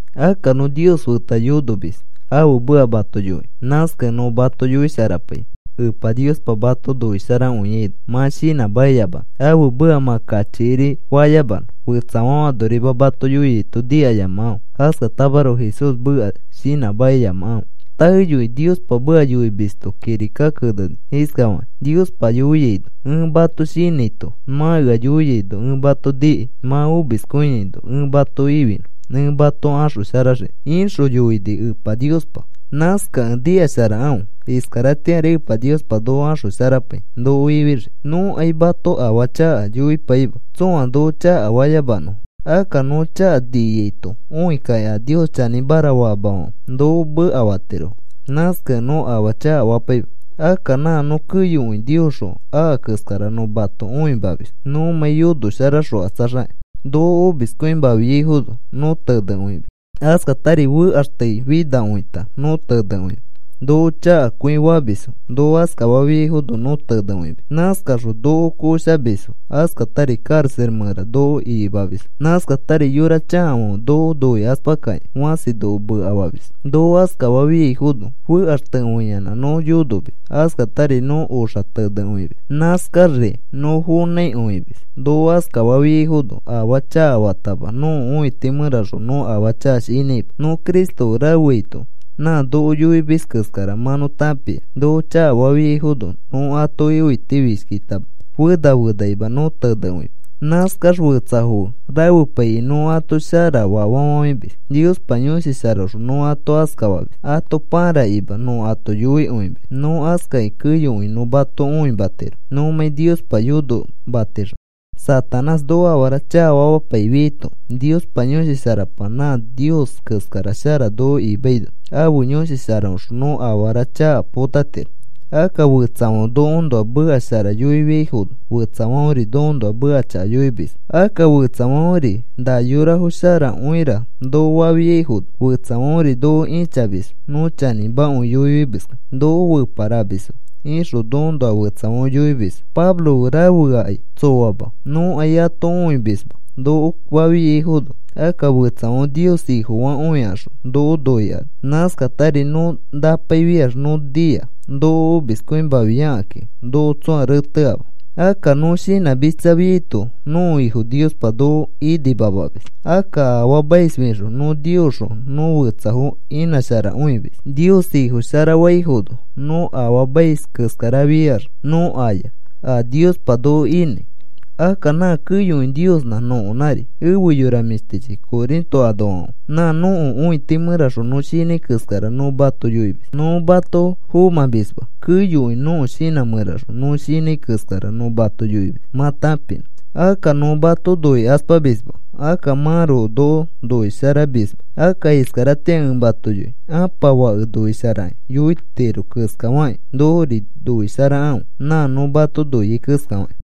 Akka nõ Nios feta yonomis ãfe meka mato yoikĩ. Nãskakẽ nõ mato yoisharapai Epa Niospa mato noisharakõiaino, mã shinãmakiyamanõ, ãfe meka mã kachikiri fayamanõ. Fetsafãfe anorima mato yoiaito nikayamakãfe. Askatamaroko Jesús meka shinãmakiyamakãfe. Taeyokĩ Niospa meka yoimisto kirika keneni iskafakĩ Niospa yoiaino: Ẽ mato shinãito, mã ea yoiaino ẽ mato nikai mã omiskõiaino. Ẽ mato ifinõ, ẽ mato axosharaxiki, ixõ yoini Epa Niospa. Nãskakẽ nikasharakãfe iskaratĩari Epa Niospa noko axosharapai noko ifixii. Nõkai mato afaa chaka yoipaima tsõa noko chakafayamanõfo. Akka nõ chaka niaito õikaki a Nios chanĩmara faamafãfe noko mekafatirofo. Nãskakẽ nõ afaa chakafapaima. Akka nã nõ keyokõi Niosxõ aka keskara nõ mato õimamis nõmãi yonoxokatsaxakĩ. Noko omiskõimafiaifono nõ tenekõimis. Askatari fekaxteifinakõita nõ tenekõimis. Noko chakakõi famisfo, noko askafafiaifono nõ tenekõimis. Nãskakaxõ noko koshamisfo, askatari karaxa mẽra noko ikimamisfo. Nãskatari yora chakafãfe noko noikaspakakĩ fãsi noko mekafamisfo. Noko askafafiaino fekaxtekõiyanã nõ yonomis. Askatari nõ oxa tenekõimis. Nãskaxri nõ fonãikõimis. Noko askafafiaifono afaa chakafatama nõko õiti mẽraxõ nõ afaa chaka shinãima. Nõ Cristo fe rafeaito nã noko yoimis keskara mã nõ tãpia. Noko chakafafiaifono nõ atoki õitifishkitama. Fena fenakima nõ tenekõimis. Nãskax fetsafo fe rafepaikĩ nõ ato sharafa fafafãimis Niospa Yõshi Sharaõxõ nõ ato askafamis ato pãrakĩma nõ ato noikõimis. Nõ askakĩ keyokõi nõ mato õimatiro nõmãi Niospa yonomatixõ. Satanás noko afara chakafamapaifiaito Niospa Yõshi Sharapa nã Nios keskara shara noko imaino ãfe Yõshi Sharaõxõ nõ afara chaka potatiro. Akka fetsafãfe nokoõnoa meka shara yoifiaifono fetsafãferi nokoõnoa meka chaka yoimisfo. Akka fetsafãferi na yorafo sharakõira noko fafiaifono fetsafãferi noko ĩchamisfo. Nõ chanĩmakõi yoifimiskẽ noko feparamisfo ixõ nokoõnoa fetsafãfe yoimisfo. “Pablo fe rafeakai tsoama. Nõkai ato õimisma,” noko fafiaifono akka fetsafãfe Nios Ifofakõikaxõ noko noikani. Nãskatari nõ napaifiax nõ nia. Noko omiskõimafiakakĩ noko tsõa reteama. Akka nõ shinãmitsafiaito nõko Ifo Niospa noko inimamamis. Akka afaamaisfixõ nõ Niosxõ nõ fetsafo imasharakõimis, Nios Ifo shara faifono. Nõ afaamais keskarafiax nõ aya a Niospa noko inãi. Akka nã keyokõi Niosnã nõkonãri. Efe yora mĩshtichi Corinto anoafãfe, nã nõko õiti mẽraxõ nõ shinãi keskara nõ mato yoimis. Nõ mato fomãmisma. Keyokõi nõko shinã mẽraxõ nõ shinãi keskara nõ mato yoimis mã tãpinõ. Akka nõ mato noikaspamisma. Akka mãroko noko noisharamisma. Akka iskaratĩa ẽ mato yoi ãpa fake noisharakĩ yoitiro keskafakĩ, nokori noisharakãfe nã nõ mato noiai keskafakĩ.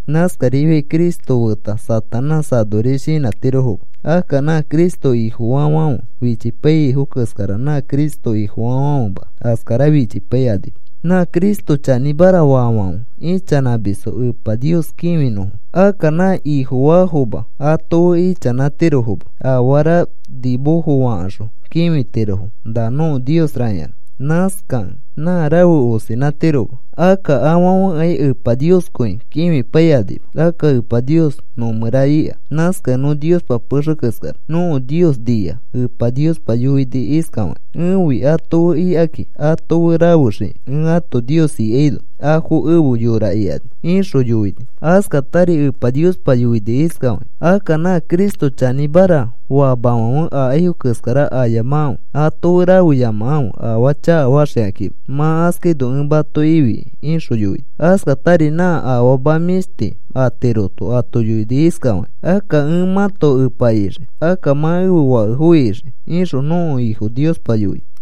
Nãskarifiakĩ Cristo feta Satanás anoris shinãtirofoma. Akka nã Cristo Ifofaafãfe fichipaiyaifo keskara nã Cristo Ifofaafãfema askara fichipaikanima. Nã Cristo chanĩmara faafãfe ichanãmisfo Epa Nios kĩfinõfo. Akka nã Ifofaafoma ato fe ichanãtirofoma afara nimofo fakaxõ kĩfitirofo na nõko niosra ikaxõ. Nãskakẽ nã rafe osinãtiroma. Akka afãfekai Epa Nioskõi kĩfipaikanima. Akka Epa Nios nõ mẽra ika. Nãskakẽ nõ Niospa pexe keskara. Nõko Nios nia. Epa Niospa yoini iskafakĩ: Ẽfi ato fe ikikai, ato fe rafexikĩ. Ẽ ãto Nios ikaino afo efe yora ikani, ixõ yoini. Askatari Epa Niospa yoini iskafakĩ: Akka nã Cristo chanĩmara faamafãfe akaifo keskara ayamakãfe. Ato fe rafeyamakãfe afaa chakafaxikãkima. Mã askaino ẽ mato ifikai, ixõ yoini. Askatari nã afama mĩshti atiroto ato yoini iskafakĩ: Akka ẽ mãto Epa ixii. Akka mã ẽfe fakefo ixii, ixõ nõko Ifo Niospa yoini.